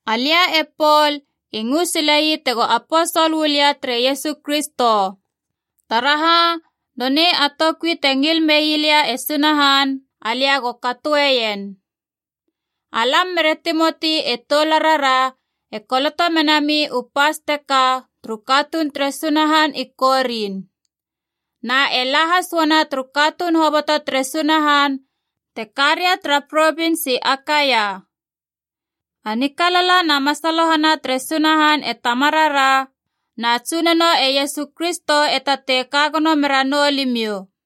Alia e Pol i ngö silei tego aposol uu lia tere Iesu Kristo. Taraha, nonei a toukui te ngil mei lia e Sunahan, alia go katoeien. Alam mere Timoti e toularara, e koloto menami u pas teka, turu katuun tere Sunahan i Korin. Na e la has uana turu katuun hoboto tere Sunahan te ka ria tara provins i Akaia. A nikalala na masalohana tere Sunahan e Tamarara, na Tsunono e Iesu Kristo e tatei kagono meranou limiou.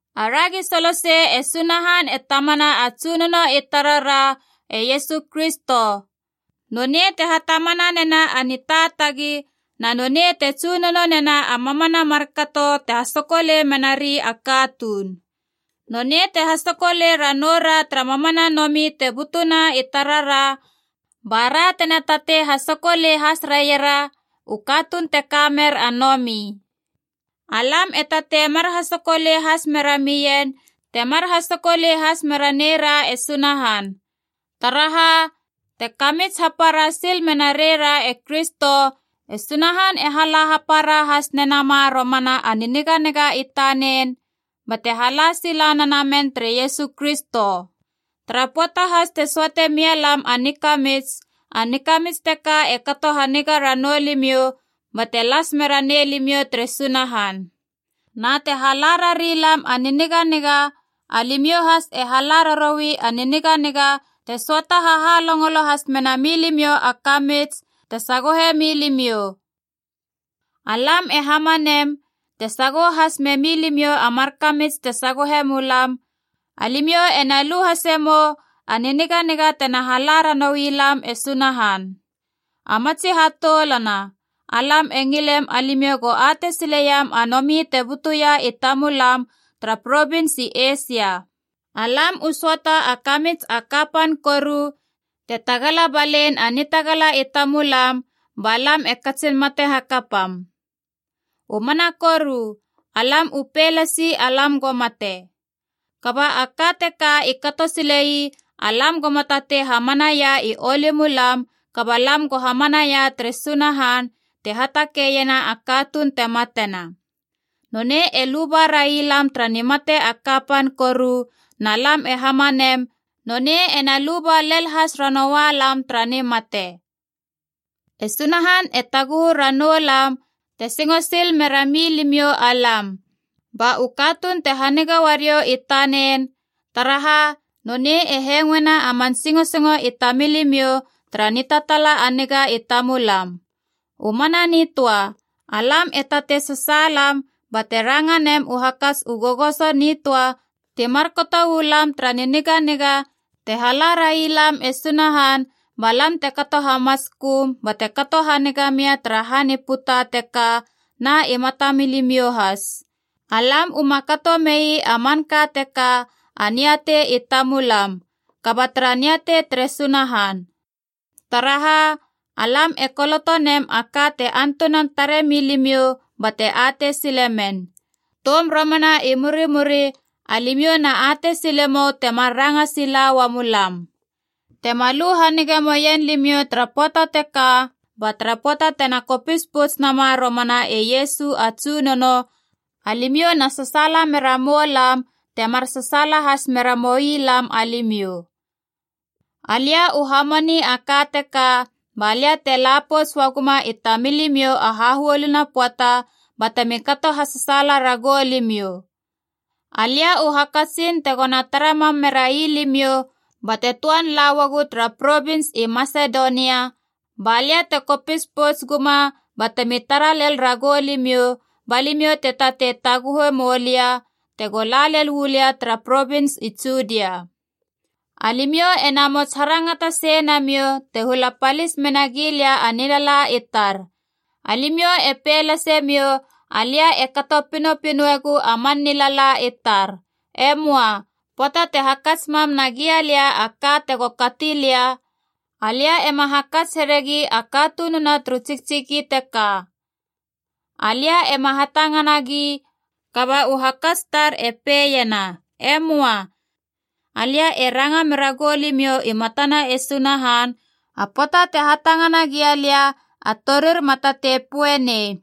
Aragi solosei e Sunahan e Tamana a Tsunono i tarara e Iesu Kristo. Nonei te hatamana nena a nitaatagi na nonei te Tsunono nena a mamana a markato te hasokolei menari a katuun. Nonei te hasokolei ranou ra tara mamana nomi te butuna i tarara bara tena tatei hasokolei has raiera u katuun te kamer a nomi. Alam e tatei mar hasokolei has mera mien temar hasokolei has mera neira e Sunahan. Taraha, te kamits hapara sil mena reira e Kristo, e Sunahan e hala hapara has nenama romana a niniganiga i tanen bate hala sila nenamen tere Iesu Kristo. Tara pöata has te söate mialam a nikamits, a nikamits teka e kato haniga ranou limiou bate las mera nei limiou tere Sunahan. Na te hala rari lam a niniganiga alimiou has e hala raroui a niniganiga te söata hahalongolo has mena milimiou a kamits te sagohe milimiou. Alam e hamanem, te sagoho has memilimiou a mar kamits te sagohe mulam, alimiou ena lu hase mou a niniganiga tena hala ranouilam e Sunahan. A matsi hatoulana, alam e ngilem alimiou go atei sileiam a nomi te butuia i tamulam tara provins i Eisia. Alam u söata a kamits a kapan koru, te tagala balein a nitagala i tamulam, ba lam e katsin mate hakapam. U mana koru, alam u pei lasi alam go mate. Kaba a ka teka i kato sile ii alam goma tatei hamanaia i oulumulam, kaba lam go hamanaia tere Sunahan, te hatakeiena a katuun te matena. Nonei e luba raialam tara nimate a kapan koru, na lam e hamanem nonei ena luba lel has ranoua lam tara nimate. E Sunahan e taguhu ranoulam te singo sil mera milimiou alam. Ba u katuun te haniga uariou i tanen taraha, nonei e hengoena a man singosingo i tamilimiou tara nitataala a niga i tamulam. U mana nitöa, alam e tatei sasaalam bate ranga mem u hakats u gogoso nitöa ti marka uu lam tara niniganiga te hala railam e Sunahan, ba lam te kato hamatsköm bate kato haniga mia tara han i puta teka na i mata milimiou has. Alam uma kato mei a manka teka a niatei i tamulam, kaba tara niatei tere Sunahan. Taraha, alam e koloto nem a ka te antunan tare milimiou bate atei sile men. Toum romana i murimuri alimiou na atei sile mou temar ranga sila ua mulam. Tema lu hanige moien limiou tara pöata teka, ba tara pöata tena kopis pouts nama romana e Iesu a Tsunono, alimiou na sasaala mera moulam temar sasaala has mera moi lam alimiou. Alia u hamani a ka teka balia te la pouts ua guma i tamilimiou a hahuolina pöata, batemi kato hasasaala ragou limiou. Alia u hakatsin tegona tara mam merai limiou bate töan la uagu tara provins i Masedonia, balia te kopis pouts guma batemi tara lel ragou limiou, ba limiou te tatei taguhe moulia tego la lel uu lia tara provins i Judia. Alimiou ena mots harangata sei namiou te hula palis menagi lia a nilala i tar. Alimiou e pei lasemiou alia e kato pinopinoegu a man nilala i tar. E möa. Pöata te hakats mam nagia lia a ka tego kati lia, alia ema hakats heregi a katununa turu tsiktsiki teka. Alia ema hatangana gi kaba u hakats tar e peiena, E möa. Alia e ranga mera gou limiou i matana e Sunahan, a pöata te hatangana gia lia, a torir ma tatei poenei,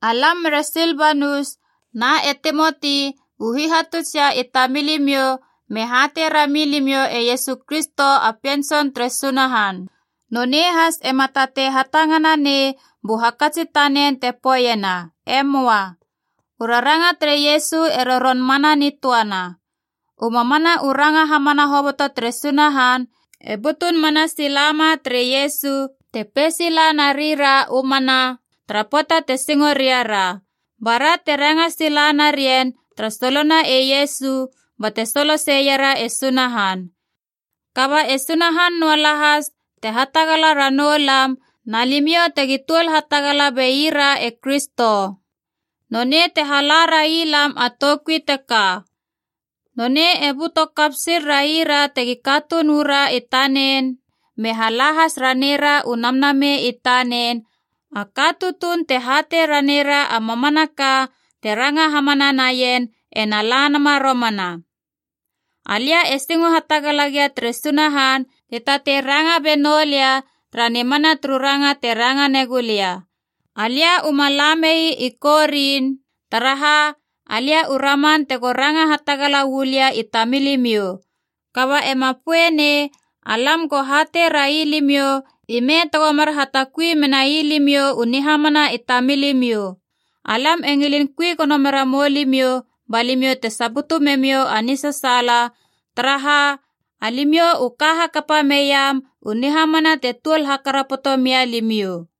Alam mere Silbanus na e Timoti u hihatutsia i tamilimiou me hatei rami limiou e Iesu Kristo a Pien Tson tere Sunahan. Nonei has ema tatei hatangana nei bu hakats i tanen te poeiena E möa. U raranga tere Iesu e roron mana nitöana. U mamana u ranga hamana hoboto tere Sunahan e butun mana sila ma tere Iesu, te pei sila na rira “U mana” tara pöata te singo ria ra. Bara te ranga sila narien tara solona e Iesu bate soloseiera e Sunahan. Kaba e Sunahan noa lahas te hatagala ra noulam na limiou tegi tuol hatagala beira e Kristo. Nonei te hala railam a toukui teka. Nonei e böto kap sil raira tegi katuun uu ra i tanen, me hala has raneira u Namnamei i tanen, a ka tutuun te hatei raneira a mamanaka te ranga hamana naien ena la nama romana. Alia e singo hatagala gia tere Sunahan te tatei ranga be noulia tara nimana turu ranga te ranga negu lia. Alia u ma la mei i Korin, taraha alia u raman tego ranga hatagala uu lia i tamilimiou. Kaba ema poeie nei alam go hatei rai limiou ime tego mar hatakui menai limiou u nihamana i tamilimiou. Alam e ngilin kui gono mera mou limiou ba limiou te saputu memiou a nisasaala, taraha, alimiou u ka hakapa meiam u nihamana te tuol hakarapoto mia limiou.